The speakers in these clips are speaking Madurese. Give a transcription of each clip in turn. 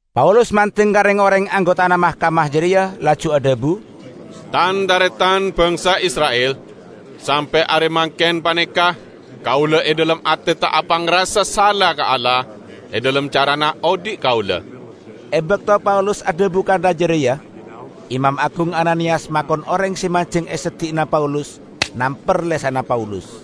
Paulus mandeng ka reng-oreng anggotana mahkamah jareya, laju adhabu, "Tan-taretan bangsa Isra'il! Sampe' are mangken paneka kaula e dhalem ate ta' apangrasa sala ka Allah e dhalem carana odhi' kaula." E bakto Paulus adhabu kantha jareya, Imam Agung Ananiyas makon oreng se manjeng e seddi'na Paulus namper lesanna Paulus.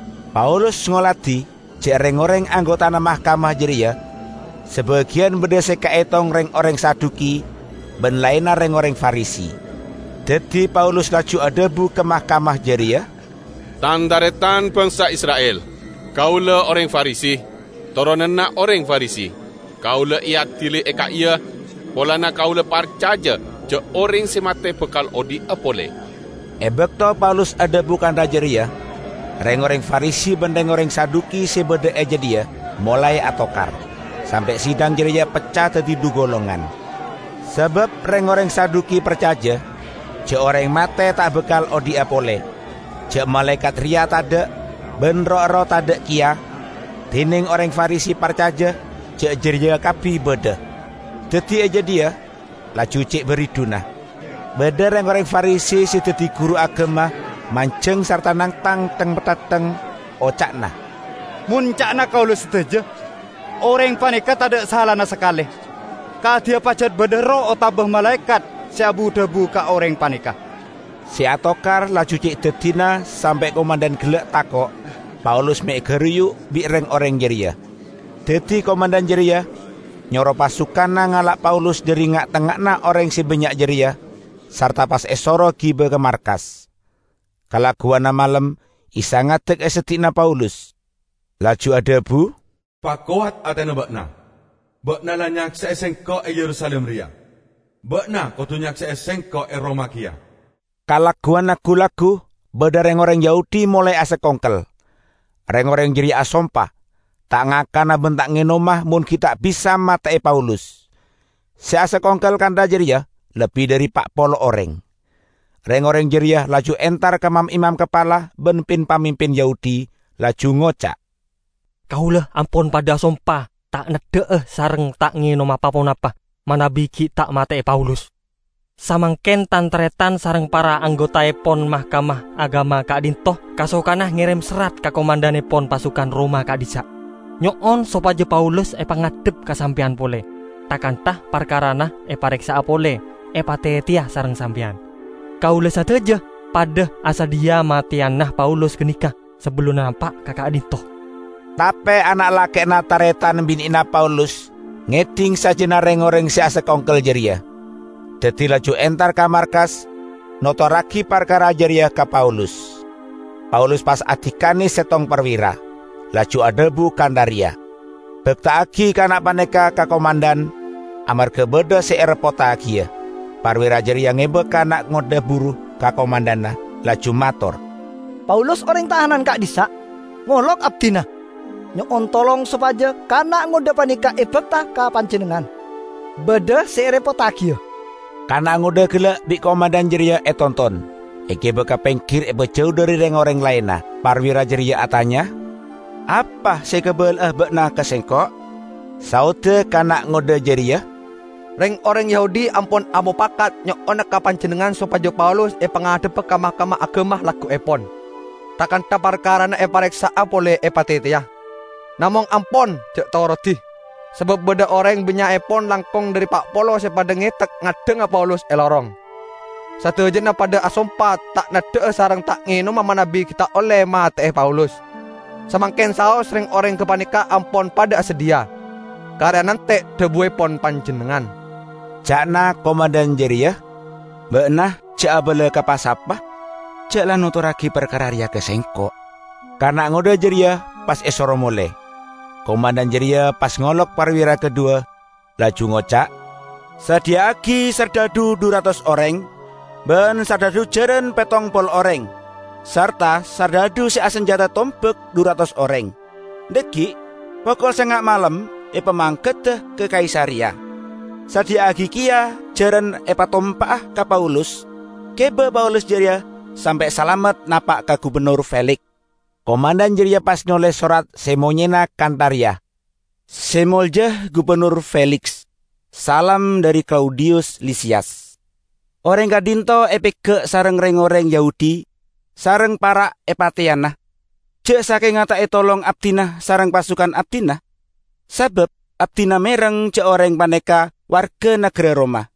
Paulus ngoladi ja' reng-oreng anggotana mahkamah jareya sabagiyan badha se kaetong reng-oreng Saduki ban laenna reng-oreng Farisi. Daddi Paulus laju adhabu ka mahkamah jareya, "Tan-taretan bangsa Isra'il! Kaula oreng Farisi, toronanna oreng Farisi. Kaula eadili e ka'iya polana kaula parcaja ja' oreng se mate bakal odhi'a pole." E bakto Paulus adhabu kantha jareya, reng-oreng Farisi ban reng-oreng Saduki se badha e jadhiya molae atokar, sampe' sidang jareya pecca daddi dhu golongan. ( Sabab reng-oreng Saduki parcaja ja' oreng mate ta' bakal odhi'a pole, ja' malaekat reya tadha', ban roh-erroh tadha' keya; dineng oreng Farisi parcaja ja' jareya kabbi badha.) Daddi e jadhiya laju ce' baridhuna. Badha reng-oreng Farisi se daddi guru agama manjeng sarta nangtang theng-mathettheng; oca'na, "Mon ca'na kaula sadaja, oreng paneka tadha' salana sakale! Kadiya pajat badha erroh otaba malaekat se abu-dhabu ka oreng paneka!" Se atokar laju ce' daddina sampe' komandhan gella' tako' Paulus me' egaruyu' bi' reng-oreng jareya. Daddi komandhan jareya nyoro pasukanna ngala' Paulus dhari nga'-tengnga'anna oreng se bannya' jareya sarta pas esoro giba ka markas. Kalagguwanna malem Isa ngadek e seddi'na Paulus, laju adhabu, "Pakowat atena ba'na! Ba'na la nyakse'e Sengko' e Yerusalim reya. Ba'na kodu nyakse'e Sengko' e Roma keya." Kalagguwanna gu-laggu badha reng-oreng Yahudi molae asakongkel. Reng-oreng jareya asompa ta' ngakana ban ta' ngenoma mon gi' ta' bisa mate'e Paulus. Se asakongkel kantha jareya lebbi dhari pa' polo oreng. Reng-oreng jareya laju entar ka mam-imam kapala ban pin-pamimpin Yahudi, laju ngoca', "Kaula ampon padha asompa ta' neddha'a sareng ta' ngenoma pa-ponapa manabi gi' ta' mate'e Paulus. Samangken Tan-taretan sareng para anggotaepon Mahkamah Agama ka'dhinto' kasokana ngerem serrat ka komandhannepon pasukan Roma ka'dhissa', nyo'on sopaja Paulus epangadhep ka sampeyan pole, tha-kantha parkarana epareksa'a pole epateteya sareng sampeyan. Kaula sadaja padha asadhiya mateyana Paulus ganeka sabellunna napa' ka ka'dhinto'." Tape ana' lake'na taretan bine'na Paulus ngedhing sajjana reng-oreng se asakongkel jareya, daddi laju entar ka markas notorragi parkara jareya ka Paulus. Paulus pas adikane settong parwira, laju adhabu kantha reya, "Bakta'agi kana' paneka ka komandhan, amarga badha se ereppottagiya." Parwira jareya ngeba kana' ngodha buru ka komandhanna, laju mator, "Paulus, oreng tahanan ka'dhissa', ngolok abdina, nyo'on tolong sopaja kana' ngodha paneka ebakta ka panjennengngan; badha se ereppottagiya." Kana' ngodha gella' bi' komandhan jareya etonton, egiba ka penggir epajau dhari reng-oreng laenna; parwira jareya atanya, "Apa se ekabala'a ba'na ka sengko'?" Saodda kana' ngodha jareya, "Reng-oreng Yahudi ampon amopakat nyo'ona ka panjennengngan sopaja Paulus epangadhebba ka Mahkamah Agama lagguepon, tha-kantha parkarana epareksa'a pole epateteya. Namong ampon ja' torodi, sabab badha oreng bannya'epon langkong dhari pa' polo se padha ngetek ngaddhanga Paulus e lorong. Sadajana padha asompa ta' neddha'a sareng ta' ngenoma manabi gi' ta' olle mate'e Paulus. Samangken saos reng-oreng gapaneka ampon padha asadhiya; kare anante' dhabuepon panjennengngan." Ca'na komandhan jareya, "Ba'na ja' abala ka pa-sapa ja' la notorragi parkara reya ka sengko'." Kana' ngodha jareya pas esoro mole. Komandhan jareya pas ngolok parwira kadhuwa, laju ngoca', "Sadhiya'agi sardhadhu dhu ratos oreng ban sardhadhu jaran pettong polo oreng, sarta sardhadhu se asanjata tombak dhu ratos oreng; dhaggi' pokol sanga' malem epamangkada ka Kaisareya. Sadhiya'agi keya jaran epatompa'a ka Paulus, giba Paulus jareya sampe' salamet napa' ka Gubennor Feliks." Komandhan jareya pas noles sorat se monyena kantha reya, "Se Molja Gubennor Feliks. Salam dhari Klaudiyus Lisiyas! Oreng ka'dhinto' epega' sareng reng-oreng Yahudi, sareng para' epateyana, ja' sakenga ta' etolong abdina sareng pasukan abdina, sabab abdina mereng ja' oreng paneka warga nagara Roma.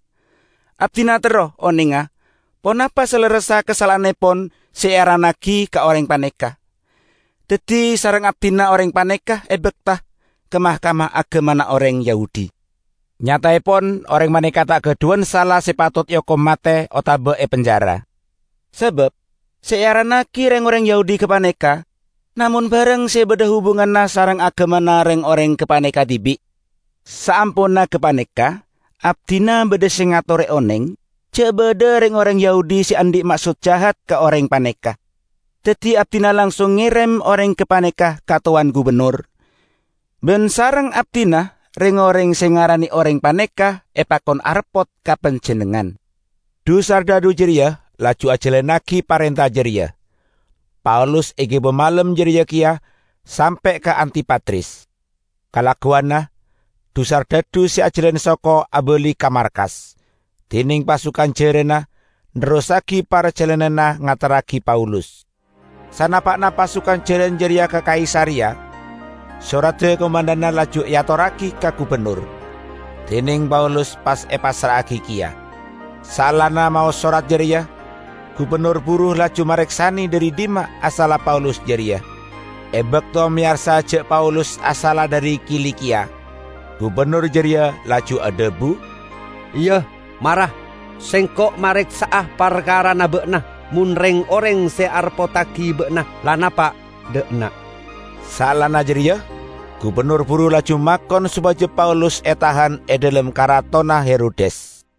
Abdina terro onenga ponapa salerressa kasala'annepon se earannagi ka oreng paneka, daddi sareng abdina oreng paneka ebakta ka Mahkamah Agamana oreng Yahudi. Nyataepon oreng paneka ta' gadhuwan sala se patot eokom mate otaba epenjara. Sabab se earannagi reng-oreng Yahudi gapaneka namong barang se badha hubunganna sareng agamana reng-oreng gapaneka dibi'. Saamponna gapaneka abdina badha se ngatore oneng ja' badha reng-oreng Yahudi se andhi' maksod jahat ka oreng paneka. Daddi abdina langsung ngerem oreng gapaneka ka Towan Gubennor. Ban sareng abdina reng-oreng se ngarane oreng paneka epakon areppot ka panjennengngan." Dhu-sardhadhu jareya laju ajalannagi parenta jareya. Paulus egiba malem jareya keya sampe' ka Antipatris. Kalagguwanna dhu-sardhadhu se ajalan soko abali ka markas, dineng pasukan jaranna nerrossagi parjalananna ngaterragi Paulus. Sanapa'na pasukan jaran jareya ka Kaisareya, soradda komandhanna laju eatorragi ka gubennor, dineng Paulus pas epassra'agi keya. Saellana maos sorat jareya, gubennor buru laju mareksane dhari dhimma asalla Paulus jareya. E bakto meyarsa ja' Paulus asalla dhari Kilikiya, gubennor jareya laju adhabu, "Iya, mara, sengko' mareksa'a parkarana ba'na mon reng-oreng se areppottagi ba'na la napa' dha' enna'." Saellana jareya gubennor buru laju makon sopaja Paulus etahan e dhalem karatonna Herodes.